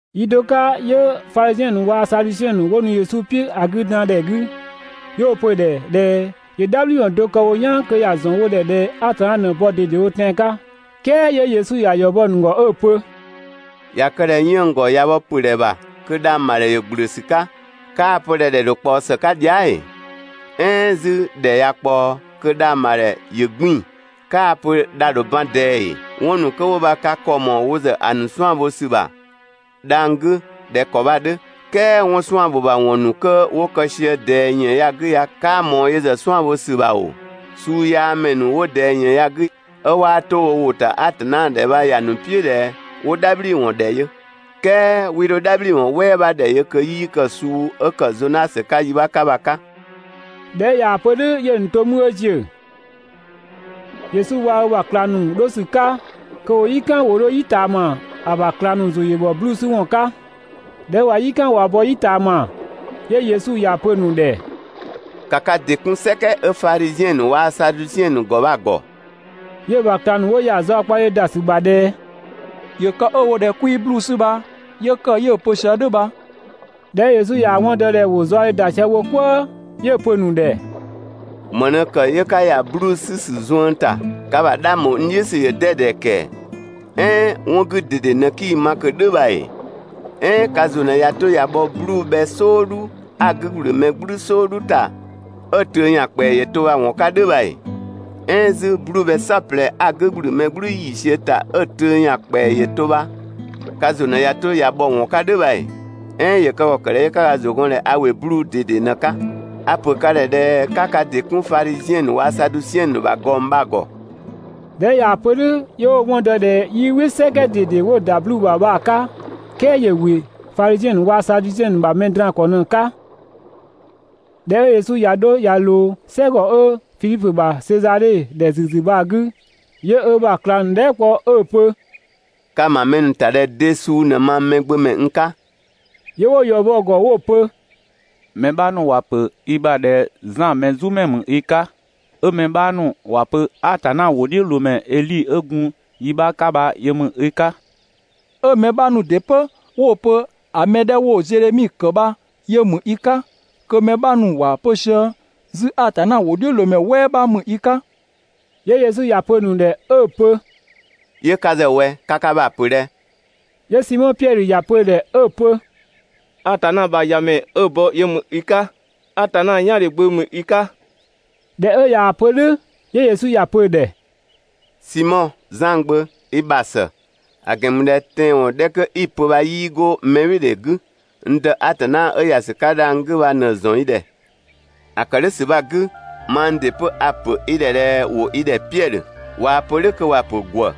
Yi do 'ka 'yö Fadhiziɛn ‑nu waa‑ Sadusiɛn ‑nu 'wo nu Yesu "piʋ̈ ‑a 'gü dan ‑dhɛ 'gü, 'yö 'wo‑ pö‑ ‑dhɛ ꞊dhɛ ‑yö "dhabhliwɔn do kë wo "yaan kö ‑ya ‑zɔn wo ‑dhɛ ꞊dhɛ Atanna ꞊në‑ bɔ ꞊dedewo tɛan‑ 'ka. "Kɛɛ 'yö Yesu ‑ya ‑yɔ bɔ‑ ‑nu ‑gɔ 'ö‑ pö: «꞊Ya kë ꞊dhɛ 'yënng‑ ‑gɔ ꞊ya bhɔ ‑pö ‑dhɛ ‑bha kö dhang‑ ‑bha ‑dhɛ ‑yö ‑gblö ‑sü 'ka 'kaa‑ pö ꞊dhɛ ‑dhɛ ‑dho ꞊kpaɔ ‑së 'ka dhia" ‑ee? "Ɛɛn 'zü ‑dhɛ ꞊ya ꞊kpaɔ kö dhang‑ ‑bha ‑dhɛ ‑yö 'gbiin‑, 'kaa‑ pö dha‑ ‑dho ban ꞊dɛɛ ‑ee? 'Wɔn ‑nu 'kö 'wo bha ka ‑kɔ ‑mɔɔ wo ‑zë ‑a ‑nu 'suan‑ bho ‑sü ‑bha dhang‑ 'gü ꞊dhɛ ‑kɔ bha‑ 'dhö, "kɛɛ 'wɔn 'suan‑ ‑bho ‑bha ‑wɔn ‑nu 'kö 'wo kë sië ꞊dɛɛ ‑yën ya‑ 'gü ya 'kaa ꞊mɔɔ yö ‑zë 'suan‑ bho ‑sü ‑bha ‑oo? Suu yaa ‑mɛ ‑nu 'wo ꞊dɛɛ ‑yën ya‑ 'gü 'ö 'waa 'to wo ‑wʋ ‑ta Atanna ‑dhɛ bha ‑ya ‑nu "piʋ̈ ꞊dhɛ 'wo "dhabhliwɔn ‑dhɛ yö, "kɛɛ 'wii 'dho "dhabhliwɔn "wɛɛ 'bha ‑dhɛ yö kö 'yii kë‑ suu 'ö ‑kë Zonasö 'ka yi 'bha 'ka bha‑ 'ka.» ꞊Dhɛ 'ö ꞊yaa‑ pö "dhʋ̈, 'yö‑ ‑nu to 'mü 'ö ‑ziö. Yesu waa‑ ö ‑bha ꞊klang ‑nu 'dho ‑sü 'ka kö ‑wo "yi "kan ‑wo 'dho "yi ꞊taama, ‑a ‑bha ꞊klang ‑nu ‑zʋ ‑yö ‑bhɔ 'bluu‑ 'sü ‑wɔn 'ka. ꞊Dhɛ 'ö ꞊wa "yi "kan ꞊wa bɔ "yi ꞊taama, 'yö Yesu ‑ya pö‑ ‑nu ‑dhɛ: «‑Ka ka ‑dɩ 'kun "sɛkɛ 'ö Fadhiziɛn ‑nu waa‑ Sadusiɛn ‑nu ‑gɔ bha‑ ‑gɔ!» 'Yö‑ ‑bha ꞊klang ‑nu 'wo ‑ya zaɔkpadhe ‑da ‑sü ‑bha ꞊dhɛ: «‑Yö kë 'ö‑ wo ꞊dhɛ 'kwii 'bluu‑ 'sü bha 'yö ‑kë 'yö‑ pö sië "dhʋ̈ bha.» ꞊Dhɛ 'ö Yesu ꞊yaa‑ 'wɔn dɔ ꞊dhɛ ‑wo zaɔdhe ‑da sië wo "kwëë 'yö‑ pö‑ ‑nu ‑dhɛ: «‑Më ꞊në ‑kë 'yö 'ka ‑ya 'bluu‑ 'sü ‑sü zuën ‑ta? Ka ‑bha 'dhang ‑bho n "dhiʋ̈ ‑sü ‑yö 'dɛdɛ ‑kɛɛ! "Ɛɛn 'wɔn 'gü ꞊dede ꞊në 'kii ma ꞊kö "dhʋ̈ bha ‑ee? "Ɛɛn ka ‑zʋ ꞊në ꞊ya 'to ꞊ya bhɔ 'bluu‑ bhɛ "sɔɔdhu 'a‑ 'gü ‑gblü mɛ "gblü "sɔɔdhu ‑ta 'ö‑ töö ‑yan ‑kpɛa ‑yö to bha‑ ‑wɔn 'ka "dhʋ̈ bha ‑ee? "Ɛɛn 'zü 'bluu‑ bhɛ "saɔplɛ 'a‑ 'gü ‑gblü mɛ "gblü ‑yiisiö ‑ta 'ö‑ töö ‑yan ‑kpɛa ‑yö to bha ka ‑zʋ ꞊në ꞊ya 'to ꞊ya bhɔ‑ ‑wɔn 'ka "dhʋ̈ bha ‑ee? "Ɛɛn ‑yö kë ‑kɔ ‑kë ꞊dhɛ 'yö 'ka ka ‑zʋ gɔn ꞊dhɛ a ‑wɩ 'bluu‑ ꞊dede ꞊në‑ 'ka? A‑ ‑pö ka ‑dhɛ ꞊dhɛ 'ka ka ‑dɩ 'kun Fadhiziɛn ‑nu waa‑ Sadusiɛn ‑nu ‑bha ꞊gɔng bha‑ ‑gɔ.» ꞊Dhɛ 'ö ꞊yaa‑ pö "dhʋ̈, 'yö 'wo‑ 'wɔn dɔ ꞊dhɛ 'yii "wɩ "sɛkɛ ꞊dede 'wo‑ ‑da 'bluu‑ ‑bha bha‑ 'ka, "kɛɛ ‑yö ‑wɩ Fadhiziɛn ‑nu waa‑ Sadusiɛn ‑nu ‑bha mɛ draan‑ ‑kɔ ꞊në‑ 'ka. ꞊Dhɛ 'ö Yesu ꞊ya 'dho ꞊ya ꞊loo "sɛgɔ 'ö Fidhipö ‑bha Sezadhe ‑dhɛ ‑züzü bha‑ 'gü, 'yö ö ‑bha ꞊klang ‑nu dhɛɛ" kpɔ 'ö‑ pö: «Ka‑ ‑ma mɛ ‑nu ‑ta ꞊dhɛ de suu ꞊në mang Mɛgbömɛ n 'ka?» 'Yö 'wo‑ ‑yɔ bɔ‑ ‑gɔ 'wo‑ pö: «Mɛ 'bha ‑nu ‑wa ‑pö i ‑bha ꞊dhɛ Zan Mɛzumɛ ‑mü i 'ka, 'ö mɛ 'bha ‑nu ‑wa pö (Atanna ‑wʋdhiʋ̈loomɛ) Edhi 'ö gun yi 'bha 'ka bha yö ‑mü i 'ka, 'ö mɛ 'bha ‑nu ‑dɩ 'pö 'wo‑ pö ‑a mɛ 'dhɛ 'wo‑ Zedhemi ‑kë bha yö ‑mü i 'ka, kö mɛ 'bha ‑nu ‑wa pö sië 'zü Atanna ‑wʋdhiʋ̈loomɛ "wɛɛ 'bha ‑mü i 'ka.» 'Yö Yesu ‑ya pö‑ ‑nu ‑dhɛ 'ö‑ pö: «'Yö ka ‑zë ꞊wɛ, ka ka ‑bha ‑pö ꞊dhɛ?» 'Yö Simɔ Piɛdhö ‑ya pö‑ ‑dhɛ 'ö‑ pö: Atanna ‑bha ‑Yamɛ 'ö‑ bɔ yö ‑mü i 'ka! Atanna "yaandhe Gbö ‑mü i 'ka!» ꞊Dhɛ 'ö ꞊yaa‑ pö "dhʋ̈, 'yö Yesu ‑ya pö‑ ‑dhɛ: «Simɔ, Zan gbö, i ‑bha ‑së! ‑A ‑gɛn ‑mü ꞊dhɛ tɛanwɔn 'dhɛ 'kö 'i‑ pö bha 'yii 'go mɛbhɩɩdhe 'gü, n Dë Atanna 'ö ‑ya ‑sü 'ka dhang‑ 'gü bha ꞊në‑ ‑zɔn i ‑dhɛ. ‑A ‑kë "dhʋ̈ ‑sü bha‑ 'gü mang ‑dɩ 'pö a‑ ‑pö i ‑dhɛ ꞊dhɛ ‑wo i ‑dhɛ Piɛdhö (꞊waa‑ pö "dhʋ̈ kö ‑wa ‑pö ‑gwë).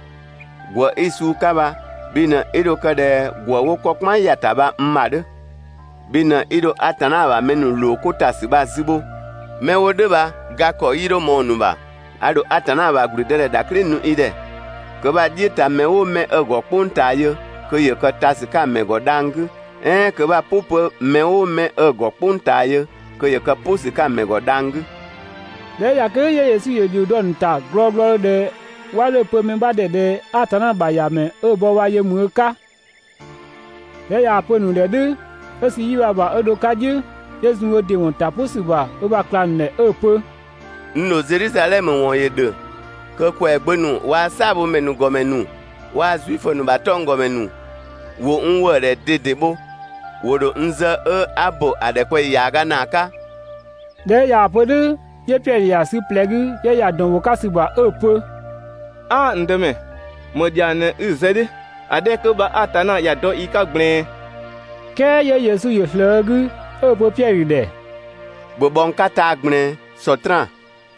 ‑Gwë 'i‑ suu 'ka bha, bhi ꞊në 'i dho kë ꞊dhɛ ‑gwë 'wo 'kɔ "kpan ‑ya ‑ta bha n ‑bha 'dhö, (bhi ꞊në 'i dho Atanna ‑bha mɛ ‑nu ‑loo 'ko ‑ta ‑sü bha‑ zü bho), 'mɛ 'wo "dhʋ̈ bha ga ‑kɔ 'yii 'dho ꞊mɔɔ‑ ‑nu ‑bha. A ‑dho Atanna ‑bha ‑gblüdëdhɛ ‑dhaklɩ nu i ‑dhɛ, kö 'bha‑ "dhiʋ̈ ta mɛ "ʋʋ 'mɛ 'ö‑ ‑gɔ "kpʋng ꞊taa yö kö ‑yö kë ta ‑sü 'ka‑ ‑mɛ ‑gɔ dhang‑ 'gü, "ɛɛn kö 'bha‑ "pʋ 'pö mɛ "ʋʋ 'mɛ 'ö‑ ‑gɔ "kpʋng ꞊taa yö kö ‑yö kë "pʋ ‑sü 'ka‑ ‑mɛ ‑gɔ dhang‑ 'gü.» ꞊Dhɛ 'ö ꞊ya kë "dhʋ̈ 'yö Yesu ‑yö ‑dhio dɔ‑ ‑nu ‑ta glɔɔglɔdhö ꞊dhɛ 'wa 'dho‑ pö mɛ 'bha ‑dhɛ ꞊dhɛ Atanna ‑bha ‑Yamɛ 'ö‑ bɔ yö ‑mü ö 'ka. ꞊Dhɛ 'ö ꞊yaa‑ pö‑ ‑nu ‑dhɛ "dhʋ̈, 'ö sü‑ 'yi bha ‑bha 'ö dho‑ 'ka "dhiʋ̈, 'yö zun ö ‑dɩ ‑wɔn ‑ta "pʋ ‑sü ‑bha ö ‑bha ꞊klang ‑nu ‑dhɛ 'ö‑ pö: «N ‑dho Zedhizadhɛmö ‑wɔn ‑yö ‑dhö kö ‑kwɛagbö ‑nu waa‑ "saabhomɛ ‑nu ‑gɔmɛ ‑nu waa‑ Zuifö ‑nu ‑bha 'tɔnggɔmɛ ‑nu ‑wo n ‑wëëdhɛ ꞊dede bho. ‑Wo ‑dho n zë 'ö 'a‑ bo ‑a ‑dhɛkpaɔyi ‑yaaga ‑naa 'ka.» ꞊Dhɛ 'ö ꞊yaa‑ pö "dhʋ̈, 'yö Piɛdhö ‑ya sü ꞊plɛ 'gü, 'yö ‑ya ‑dɔn ‑bho 'ka ‑sü ‑bha. 'Ö‑ pö: «'Aa n Dëmɛ, ‑më ‑dhiang ꞊në 'i‑ zë "dhʋ̈, ‑a 'dhɛ 'kö bha Atanna ‑ya dɔ i 'ka ꞊gblɛɛn.» "Kɛɛ 'yö Yesu ‑yö ꞊slëë ö 'gü, 'ö‑ pö Piɛdhö ‑dhɛ: «‑Bhö bhɔ n 'ka taa‑ ꞊gblɛɛn, Sɔtraan!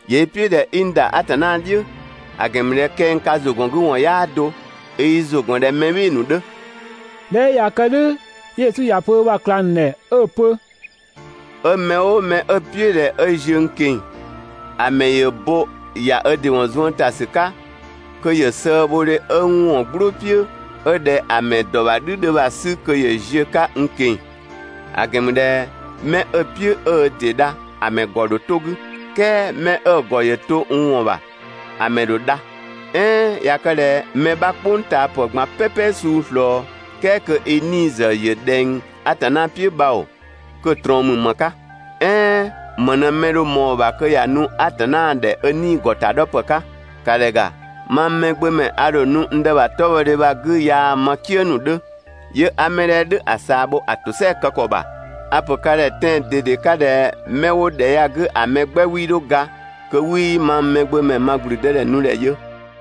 ‑Yö i "piʋ̈ ꞊dhɛ 'i n ‑da Atanna "dhiʋ̈, ‑a ‑gɛn ‑mü ꞊dhɛ kɛng ka ‑zʋgɔngüwɔn 'yaa do, i i ‑zʋ ‑gɔn ꞊dhɛ mɛ "bhɩɩ‑ ‑nu 'dhö. ꞊Dhɛ 'ö ꞊ya kë "dhʋ̈ 'yö Yesu ‑ya pö ö ‑bha ꞊klang ‑nu ‑dhɛ 'ö‑ pö: «'Ö mɛ "ʋʋ mɛ 'ö‑ "piʋ̈ ꞊dhɛ 'ö ziö n ꞊keng‑, ‑a ‑mɛ ‑yö bo ‑ya ö ‑dɩ ‑wɔn zuën ‑ta ‑sü 'ka kö ‑yö sëëbhodhe 'ö n ‑wɔn "glʋʋ "piʋ̈ 'ö ꞊dhɛ ‑a ‑mɛ ‑dɔ ‑bha "dhü 'dhö bha‑ 'sü kö ‑yö ziö‑ 'ka n ꞊keng‑. ‑A ‑gɛn ‑mü ꞊dhɛ 'mɛ 'ö‑ "piʋ̈ 'ö ö ‑dɩ dha ‑a ‑mɛ ‑gɔ ‑dho 'to‑ 'gü, "kɛɛ 'mɛ 'ö‑ ‑gɔ ‑yö to n ‑wɔn ‑bha, ‑a mɛ ‑dho dha. "Ɛɛn ꞊ya kë ꞊dhɛ mɛ 'bha "kpʋngtaapë ꞊gban "pɛpɛ suu ꞊slɔɔ "kɛɛ kö i 'nii‑ ‑zë ‑yö ꞊dhɛng Atanna "piʋ̈ bha ‑oo, kö‑ ꞊trɔɔn ‑mü ‑më 'ka? "Ɛɛn ‑më ꞊në mɛ‑ dho ꞊mɔɔ‑ ‑bha kö ‑ya nu Atanna ‑dhɛ ö 'nii‑ ‑gɔtadhɔpë 'ka. ‑Ka ‑dhɛ ‑ga, mang Mɛgbömɛ ‑a ‑dho nu n Dë ‑bha 'tɔbhɔdhe bha‑ 'gü yaa‑ ma "kië ‑nu ‑dhö, 'yö 'a 'mɛ 'dhɛ "dhʋ̈ ‑a ꞊saa bho ‑a ‑tosɛa kë ‑kɔ ‑bha. A‑ ‑pö ka ‑dhɛ tɛan‑ ꞊dede 'ka ꞊dhɛ 'mɛ 'wo ‑dhɛ ya‑ 'gü ‑a mɛ 'gbɛ 'wii 'dho ga kö 'wii mang Mɛgbömɛ ma ‑gblüdëdhɛ nu ‑dhɛ yö.